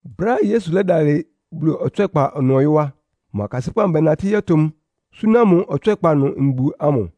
Brɛ́á Yesu lɛ́dalɩ Bulu ɔtswɛ́kpa ɩnʋ ɔyɔ́ á, mʋ akasɩ́pʋ́ amʋ bɛnatɩ́ yɔ́tʋ mʋ, súná mʋ ɔtswɛ́kpa ɩnʋ mbu ámʋ.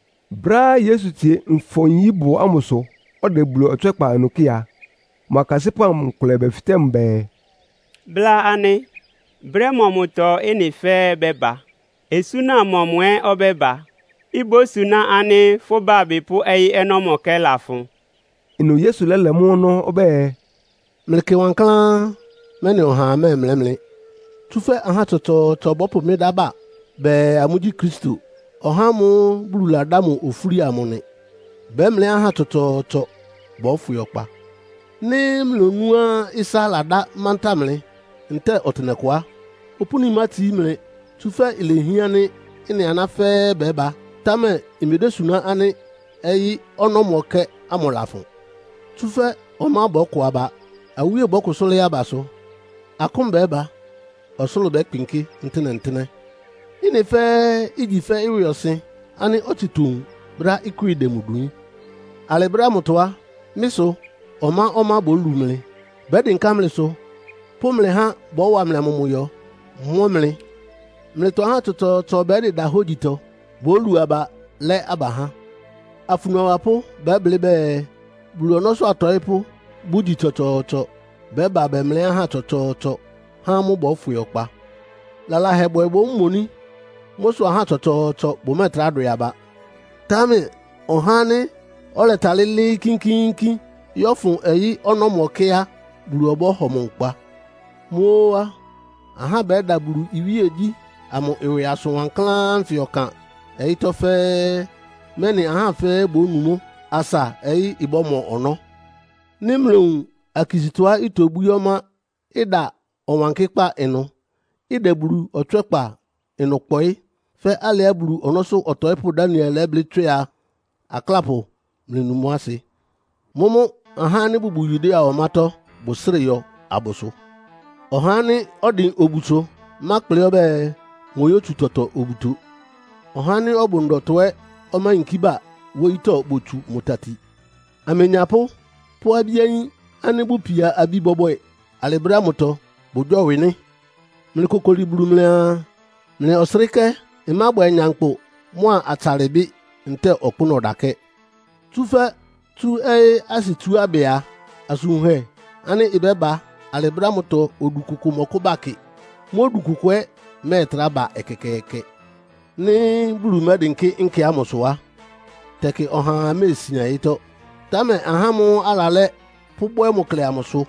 Brɛ́á Yesu tsie Nfɔ-nyíbʋ ámʋsʋ, ɔdɛ Bulu ɔtswɛ́kpa amʋ kɩ́ɩ a, mʋ akasɩ́pʋ́ amʋ nkʋlɛ bɛfɩtɛ́ mʋ bɛɛ, “Bla anɩ, brɛ́ mɔmʋtɔ ɩ́nɩ fɛ́ɛ́ bɛ́ba? Osúna mɔmʋ ɛ́ ɔbɛ́ba, ibósuná ánɩ́ fʋ́ bábɩ pʋ́ ɔyɩ́ ɔnɔ́mɔkɛ́ lafʋn?” Ɩnʋ Yesu lɛ́lɛ mʋ́ ɔnɔ́ ɔbɛ́ɛ, “Mlɩkɩ wankláán, mɛ́nɩ ɔhaa mɛ́ɛmlɛ́ mlɩ. Tsúfɛ́ ahá tsɔtsɔɔtsɔ bɔ́pʋ mɩ́ dá ba bɛɛ, amʋ́gyí Kristo, (ɔhá ámʋ́ʋ́ Bulu ladá mʋ ofúli amʋ) nɩ. Bɛ́mlɛ́ ahá tsɔtsɔɔtsɔ bɔ́fwɩ ɔkpa. Nɩ́ mlonúá ɩsá ladá mantáa mlɩ ntɛ́ɛ ɔtɩnɛkʋ á, opúni mátsií mlɩ. Tsúfɛ́ lehián ánɩ́ ɩ́nɩ aná fɛ́ɛ́ bɛ́ba, támɛ imedésuná ánɩ́ ɔyɩ́ ɔnɔ́mɔkɛ́ ámʋ lafʋn. Tsúfɛ́ ɔmá bɔ́kɔ aba. Awíe bɔ́kʋsʋ́ lɩ́ɩ́ abasʋ. Akʋ́n bɛ́ba, ɔsʋlʋ́ʋ bɛ́kpɩnkɩ́ ntɩ́nɛ́-ntɩ́nɛ́. Ɩ́nɩ fɛ́ɛ́ igyi fɛ́ ɩwɩɔsɩn ánɩ́ ɔtsɩ towun brɛ́á ɩkwɩ́ɩ dɛ mʋ dwiín. “Alɩ brɛ́ ámʋtɔ á, mɩ́ sʋ ɔmá-ɔmá bólu mlɩ. Bɛ́dɩnká mlɩsʋ, pʋ́ mlɩ há bɔ́wa mlɩ amʋmʋyɔ, mɔ́ mlɩ. Mlɩtɔ ahá tsɔtsɔɔtsɔ bɛ́dɩda hógyitɔ. Bólu aba, lɛ́ aba há. Afunu awapʋ́ bɛ́blɩ́ bɛɛ, Bulu ɔnɔ́sʋ́ atɔɩ́pʋ́ bʋgyi tsɔtsɔɔtsɔ bɛ́ba bɛmlɛ́ ahá tsɔtsɔɔtsɔ, há amʋ́ bɔ́fwɩ ɔkpa. Lalahɛbwɛ bómoní. Mʋ́ sʋ ahá tsɔtsɔɔtsɔ bʋmɛ́ɛtrá dwɛ aba. Támɛ ɔhá ánɩ́ ɔlɛtalɩ́ lɩ́ɩ́ kínkíínkín yɔ́fʋn ɔyɩ́ ɔnɔ́mɔkɛ́ á, Bulu ɔbɔ́hɔ mʋ nkpa. Mʋ́ óó á, ahá bɛ́da Bulu iwíegyí ámʋ ɩwɩ asʋn wankláán ánfɩ ɔkan ɔyɩ́tɔ́ fɛ́ɛ́, mɛ́nɩ ahá fɛ́ɛ́ bónu mʋ́, asa ɔyɩ́ ɩbɔ́mɔ ɔnɔ́. “Nɩ́ mlowun akisítɔá itobwíé ɔmá, ɩda Ɔwankɩ́kpá ɩnʋ, ɩdɛ Bulu ɔtswɛ́kpa ɩnʋ kpɔɩ́, fɛ́ alɩá Bulu ɔnɔ́sʋ́ ɔtɔɩ́pʋ́ Daniel lɛ́blɩ́ tswɩ a, —Aklápʋ, mlɩnu mʋ́ asɩ!— mʋ́mʋ́ ahá ánɩ́ bʋbʋ Yudea ɔmátɔ́ bʋsrɩ́ɩ yɔ abʋsʋ. Ɔhá ánɩ́ ɔdɩn obusʋ mákplɩ ɔbɛ́ɛ, moyótsu tɔtɔ obuto. Ɔhá ánɩ́ ɔbʋ ndɔtɔ ɛ́ ɔmáyinkí ba wóyítɔ́ botsu mʋ tati. Amenyapʋ́ pʋ́ abí-ayín ánɩ́ bʋpia abi bɔbwɛ alɩ brɛ́ ámʋtɔ, bʋgyɔ́wɩ nɩ́. Mlɩkokoli Bulu mlɩaa, mlɩ ɔsrɩ́kɛ́ amʋ ɩmábwɛ nyankpʋ mʋ́a atsalɩbɩ́ ntɛ́ɛ ɔkpʋ́nʋ́ ɔdakɛ́. Tsúfɛ́ tsú ɔyɩ́ asɩtsuábɩ a, asʋn wunhɛ ánɩ́ ɩbɛ́ba alɩ brɛ́ ámʋtɔ odu kʋkʋ mɔ́kʋ́ba kɩ. Mʋ́ odu kʋkʋ ɛ́ mɛ́ɛtrá ba ɛkɛkɛɛkɛ. Nɩ́ Bulu mɛ́dɩnkɩ́ nkɛ ámʋsʋ á, tɛkɩ ɔhaa méesian ɔyɩ́tɔ́. Támɛ ahá ámʋ́ʋ́ alalɛ́ pʋ́bwɛ́ mʋ klɛ amʋ sʋ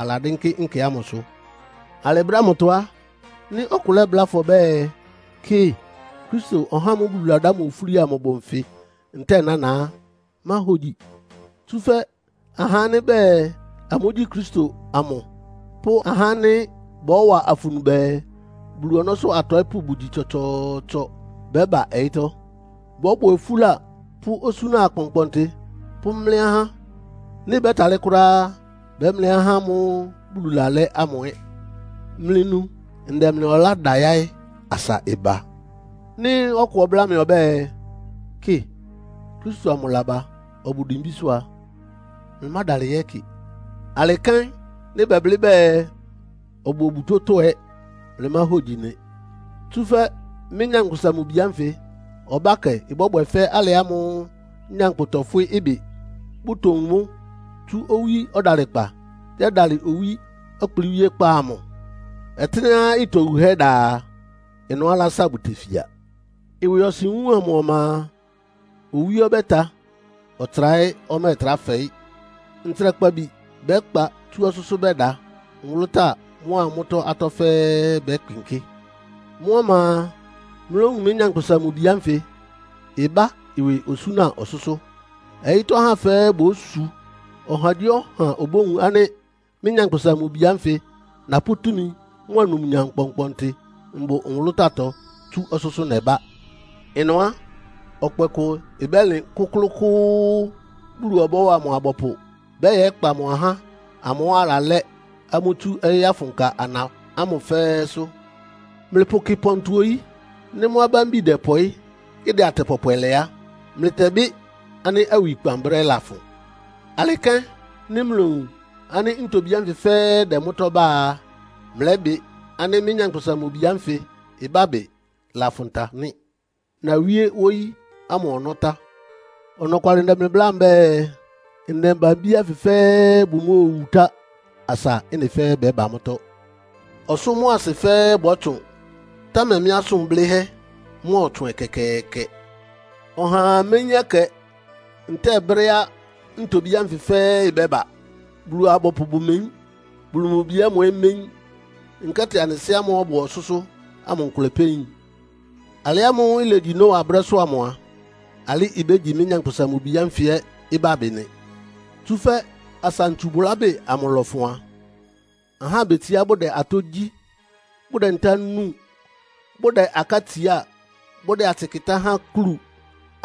aladɩ́nkɩ́ nkɛ ámʋsʋ. “Alɩ brɛ́ ámʋtɔ á, nɩ́ ɔkʋ lɛ́bláa fʋ ɔbɛ́ɛ, ‘Kɩ, Kristo, (ɔhá ámʋ́ʋ́ Bulu ladá mʋ ofúli amʋ) bʋ nfɩ ntɛ́ɛ nána’ á, máhogyi. Tsúfɛ́ ahá ánɩ́ bɛɛ amʋ́gyí Kristo amʋ pʋ́ ahá ánɩ́ bɔ́wa afunu bɛɛ, Bulu ɔnɔ́sʋ́ atɔɩ́pʋ́ bʋgyi tsɔtsɔɔtsɔ bɛ́ba ɔyɩ́tɔ́. Bɔ́bwɛ ofúla pʋ́ osúna akpɔnkpɔntɩ pʋ́mlɛ́ ahá. Nɩ́ bɛ́talɩ́ kʋ́ráá á, bɛ́mlɛ́ ahá ámʋ́ʋ́ Bulu lalɛ́ ámʋ ɛ́. Mlɩnu, ndɛ mlɩ ɔlá da yáɩ́ asa ɩba. “Nɩ́ ɔkʋ ɔbláa mlɩ ɔbɛ́ɛ, ‘Kɩ, Kristo amʋ laba ɔbʋ dimbísʋ́’ a, mlɩmádalɩ yɛ́kɩ. Alɩ kɛ́n nɩ́ bɛblɩ́ bɛɛ, ‘Ɔbʋ obutótɔ́’ ɛ́ mlɩmáhogyi nɩ. Tsúfɛ́ mɩ́, Nyankpʋsa-Mʋ-Bi ánfɩ ɔbákɛ ɩbɔ́bwɛ fɛ́ alɩ ámʋ́ʋ́ nyankpʋ tɔfwɩ́ ɩbɩ, bʋtowun mʋ́ tsú owí ɔdalɩkpa yɛ́dalɩ owí ɔkplɩ́wíékpá amʋ. “Ɔtɩ́nɛ́á ɩtɔ wuhɛ́ da a, ɩnʋ́ alása bʋtefia. “Ɩwɩɔsɩn wúun amʋ ɔma a, owí ɔbɛ́ta, ɔtsra ɛ́ ɔmɛ́ɛtrá fɛɩ́. Ntsrakpabi bɛ́kpa tsú ɔsʋ́sʋ́ bɛda. Nwʋlʋ́táa mʋ́a mʋ́tɔ́ atɔ́ fɛ́ɛ́ bɛ́kpɩnkɩ́. Mʋ́ ɔma a, mlówun mɩ́, Nyankpʋsa-Mʋ-Bi ánfɩ ɩbá ɩwɩ osúna ɔsʋ́sʋ́. Ɔyɩ́tɔ́ ahá fɛ́ɛ́ bósu. Ɔhagyíɔha obówun ánɩ́ mɩ́, Nyankpʋsa-Mʋ-Bi ánfɩ napʋ́ túmi mʋ́a numnyam kpɔnkpɔntɩ mbʋ nwʋlʋ́táatɔ tsú ɔsʋ́sʋ́ nɛbá. Ɩnʋ á, ɔkpɛ kʋ ɩbɛ́lɩn kʋ́klʋ́kʋ́ʋ́, Bulu ɔbɔ́wa mʋ abɔpʋ bɛ́yɛkpa mʋ ahá ámʋ́ʋ́ alalɛ́ ámʋ tsú ɔyɩ́ afʋnka ana ámʋ fɛ́ɛ́sʋ́. “Mlɩpʋkɩ pɔntɔ oyí. Nɩ́ mʋ́ abámbi dɛpɔɩ́, ɩdɛ atɛ pɔpwɛ lɛ á, mlɩtɛbɩ́ ánɩ́ awikpan brɛ́ lafʋn. Alɩ kɛ́n, nɩ́ mlowun ánɩ́ ntobí ánfɩ fɛ́ɛ́ ɩdɛ mʋ́tɔ́ bá a, mlɛ́bɩ ánɩ́ mɩ́, Nyankpʋsa-Mʋ-Bi ánfɩ ɩbábɩ lafʋn ta nɩ́. Nawíé wóyí ámʋ ɔnɔ́ tá. Ɔnɔkwalɩ ndɛ mlɩ bláa mbɛ́ɛ, ndɛmba-abí ánfɩ fɛ́ɛ́ bʋmóowu tá asa ɩ́nɩ fɛ́ɛ́ bɛ́ba mʋ́tɔ́. Ɔsʋ́ mʋ́a asɩ fɛ́ɛ́ bɔ́tsʋn, támɛ mɩ́ asʋn blɩ́hɛ́ mɔ́ɔtsʋn ɛkɛkɛɛkɛ. “Ɔhaa méyín ɛkɛ ntɛ́ɛ brɛ́á ntobí ánfɩ fɛ́ɛ́ ɩbɛ́ba. Bulu-abɔpʋ bʋmeyín. Bulu mʋ Bi ámʋ ɛ́ méyín, nkɛ́tɩ anɩ Sɩ́ ámʋ́ʋ́ ɔbʋ ɔsʋ́sʋ́ ámʋ nkʋlɛ pɛ́ yin. Alɩ ámʋ́ʋ́ ilegyi Noa brɛ́sʋ́ amʋ a, alɩ́ ibégyi mɩ́, Nyankpʋsa-Mʋ-Bi ánfɩ ɛ́ ɩbábɩ nɩ. Tsúfɛ́ asa ntsubʋlábɩ́ amʋ lɔfʋn a, ahá betsiá bʋ́dɛ atɔ́ gyí, bʋdɛ ntá núu, bʋdɛ aká tsiá, bʋdɛ atsɩ kɩ́tá há akúlu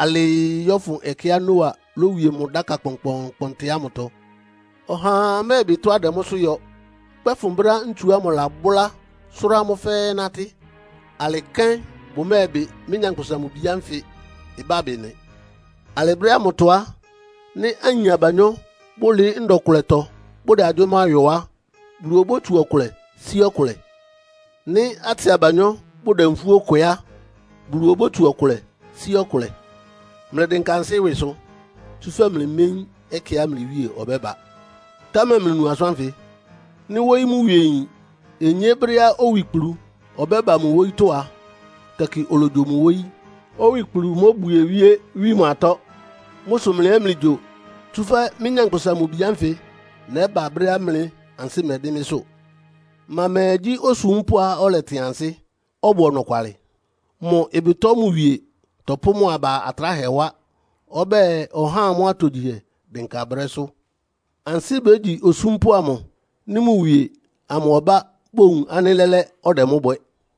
alɩɩ yɔ́fʋn ɛkɛá Noa lówie mʋ dáka kpɔnkpɔɔnkpɔntɩ ámʋtɔ. Ɔhaa mɛ́bɩ tɔ́á ɩdɛ mʋ́sʋ́ yɔ, kpɛ́fʋn brɛ́á ntsu ámʋ lɔbʋlá sʋ́rá amʋ́ fɛ́ɛ́ nátɩ́. Alɩ kɛ́n bʋmɛ́ɛbɩ mɩ́, Nyankpʋsa-Mʋ-Bi ánfɩ ɩbábɩ nɩ. Alɩ brɛ́ ámʋtɔ á, nɩ́ ayin abanyɔ́ bʋlɩɩ́ ndɔ kʋlɛtɔ bʋdɛ agyʋ́má yɔ á, Bulu obótsu ɔkʋlɛ sí ɔkʋlɛ. Nɩ́ atsɩ abanyɔ́ bʋdɛ nfúó kwɛ á, Bulu obótsu ɔkʋlɛ sí ɔkʋlɛ. “Mlɩdɩnka ansɩ́ ɩwɩsʋ, tsúfɛ́ mlɩméyín ɛkɛá mlɩ Wíe ɔbɛ́ba. Támɛ mlɩnu asʋ́n ánfɩ. Nɩ́ wóyí mʋ wie yin onyé brɛ́á owikplu ɔbɛ́ba mʋ wóyítɔ́ a, tɛkɩ ologyo mʋ wóyí, owikplu móbwie wíé, wí mʋ atɔ́. Mʋ́ sʋ mlɩ ɛ́ mlɩgyo, tsúfɛ́ mɩ́, Nyankpʋsa-Mʋ-Bi ánfɩ nɛ́ba brɛ́á mlɩ ansɩ́ mɛdɩ́n mɩ́sʋ́. “Ma mɛɛ gyí osúmpʋ́á ɔlɛtɩn ansɩ́, ɔbʋ ɔnɔkwalɩ? Mʋ ɩbɩtɔ mʋ wie tɔpʋ́ mʋ aba atráhɛ wá, ɔbɛ́ɛ ɔhá amʋ́ atogyihɛ dɩnka brɛ́sʋ́. Ansɩ́ bégyi osúmpʋ́ amʋ, nɩ́ mʋ wie amʋ ɔbá bowun ánɩ́ lɛ́lɛ́ ɔdɛ mʋ́ bwɛ.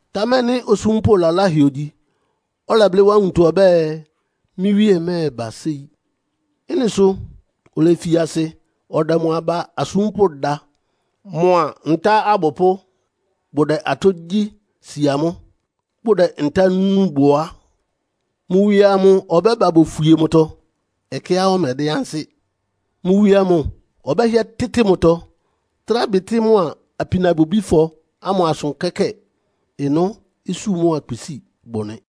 Támɛ nɩ́ osúmpʋ́ laláhɛ ogyi, ɔlɛblɩ́ wá nwuntɔ ɔbɛ́ɛ, ‘Mɩ́ wíe mɛ́ɛba séi.’ Ɩ́nɩ sʋ olefi asɩ ɔdɛ mʋ aba asúmpʋ́ da, mʋa ntá abʋpʋ́ bʋdɛ atɔ́ gyí si amʋ́, bʋdɛ ntá núu bʋ á, mʋ wie amʋ ɔbɛ́ba bófwie mʋtɔ ɛkɛá ɔmɛdɩ́n ansɩ́. Mʋ wie amʋ ɔbɛ́hɩɛ tɩ́tɩ mʋtɔ, trá bɩtɩ́ mʋa apinabwɛbífɔ ámʋ asʋ kɛ́kɛ́ɛ. Ɩnʋ́ isú mʋ́a kpisíi bʋ nɩ.